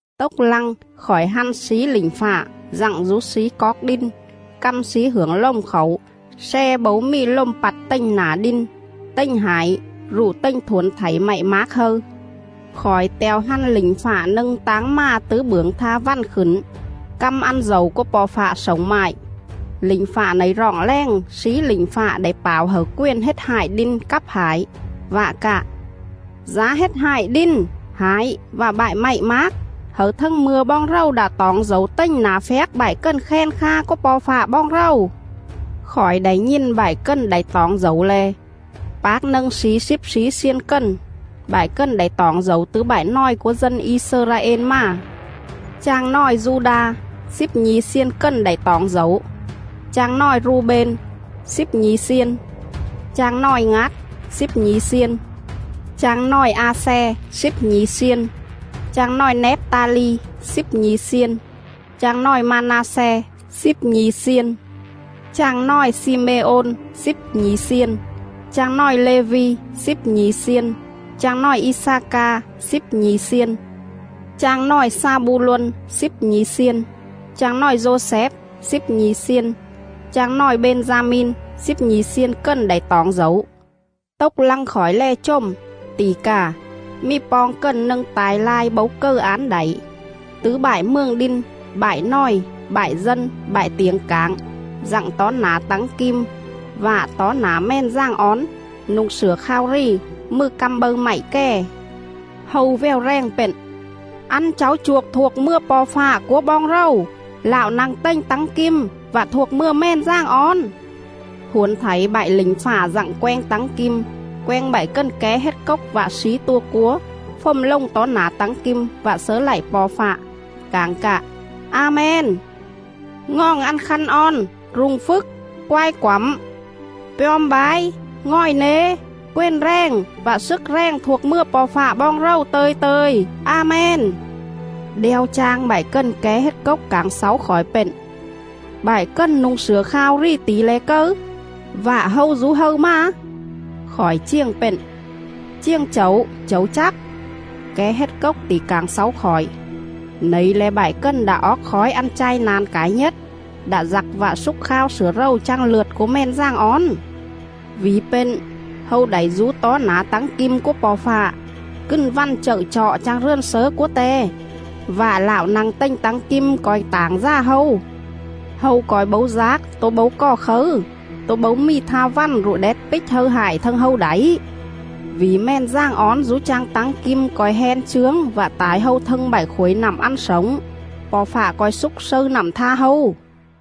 Tốc lăng, khỏi hăn slí lỉnh fạ dặng dú slí coóc đin căm slí hưởng lồm khảu sle bấu mì lồm pặt tềnh nả đin, tềnh hải rụ tềnh thuổn thảy mạy mác hâư.. Khỏi te̱o hăn lỉnh fạ nâng táng mà tứ bưởng tha vằn khửn, căm ăn dẩu cúa Po̱ Fạ slổng mại. Lỉnh fạ nẩy roọng rèng slí lỉnh fạ đảy pảo hẩư quền hết hại đin cắp hải vạ cạ: “Dá hết hại đin, hải vạ bại mạy mác, hẩư thâng mư̱a boong rầu đạ toỏng dẩu tềnh nả phjác bại cần khen kha cúa Po̱ Fạ boong rầu.”. Khỏi đảy nhìn bại cần đảy toỏng dẩu le̱: Pác nâng slí slíp slí xiên cần. Bại cần đảy toỏng dẩu tứ bại nòi cúa dân I-xơ-ra-ên mà. Chang nòi Du-đa: Slíp nhi̱ xiên cần đảy toỏng dẩu; Chang nòi Ru-bên: Slíp nhi̱ xiên; Chang nòi Ngát: Slíp nhi̱ xiên; Chang nòi A-xe: Slíp nhi̱ xiên; Chang nòi Nép-ta-li: Slíp nhi̱ xiên; Chang nòi Ma-na-xe: Slíp nhi̱ xiên; Chang nòi Xi-mê-ôn: Slíp nhi̱ xiên; Chang nòi Lê-vi: Slíp nhi̱ xiên; Chang nòi I-xa-ca: Slíp nhi̱ xiên; Chang nòi Xa-bu-lôn: Slíp nhi̱ xiên; Chang nòi Dô-xép: Slíp nhi̱ xiên; Chang nòi Bên-da-min: Slíp nhi̱ xiên cần đảy toỏng dẩu. Tốc lăng khỏi lè chồm, tỉ cà, mì poong cần nâng ta̱i lai bấu cầư án đảy, tứ bại mường đin, bại nòi, bại dân, bại tiểng cảng, dặng tó nả tắng kim vạ tó nả Mèn Dàng Ón, nu̱ng slửa khao rì, mừ căm bâư mạy kè. Hâu vèo rèng pện: “Ăn cháu chuôc thuộc mừa Po̱ Fạ cúa boong rầu, Lạo nă̱ng tềnh tắng kim, vạ thuộc mừa Mèn Dàng Ón.” Thuổn thảy bại lỉnh fạ dặng quenh tắng kim, quenh bại cần ké hết cốc vạ slí tua cúa, fồm lồng tó nả tắng kim vạ slớ lạy Po̱ Fạ, cảng cạ: “A-men! Ngoòng ăn khăn on, rung phjức, quai quẳm, pjom bái, ngòi nế, quền rèng vạ slức rèng thuộc mừa Po̱ Fạ boong rầu tơ̱i tơ̱i. A-men!” “Đeo chang bại cần ké hết cốc cảng xáu khỏi pện: Bại cần nu̱ng slửa khao rì tỉ le̱ cầư, vạ hâu dú hâư mà?” Khỏi chiềng pện: “Chiềng chẩu, chẩu chắc.” Ké hết cốc tỉ cảng xáu khỏi: “Nẩy le̱ bại cần đạ oóc khói ăn chai na̱n cải nhết, đạ dặc vạ xúc khao slửa rầu chang lượt cúa Mèn Dàng Ón.. Vỉ pện, hâu đảy dú tó nả tắng kim cúa Po̱ Fạ, cừn vằn chậư chọ chang rườn slớ cúa Te; vạ Lạo nă̱ng tềnh tắng kim co̱i tảng dà hâu. Hâu co̱i bấu dác tố bấu cò khấư, tố bấu mì tha vằn rụ đét pích hâư hại thâng hâu đảy.. Vỉ Mèn Dàng Ón dú chang tắng kim co̱i hen chướng vạ tải hâu thâng bại khuổi nặm ăn slổng. Po̱ Fạ co̱i xúc slâư nặm tha hâu.”.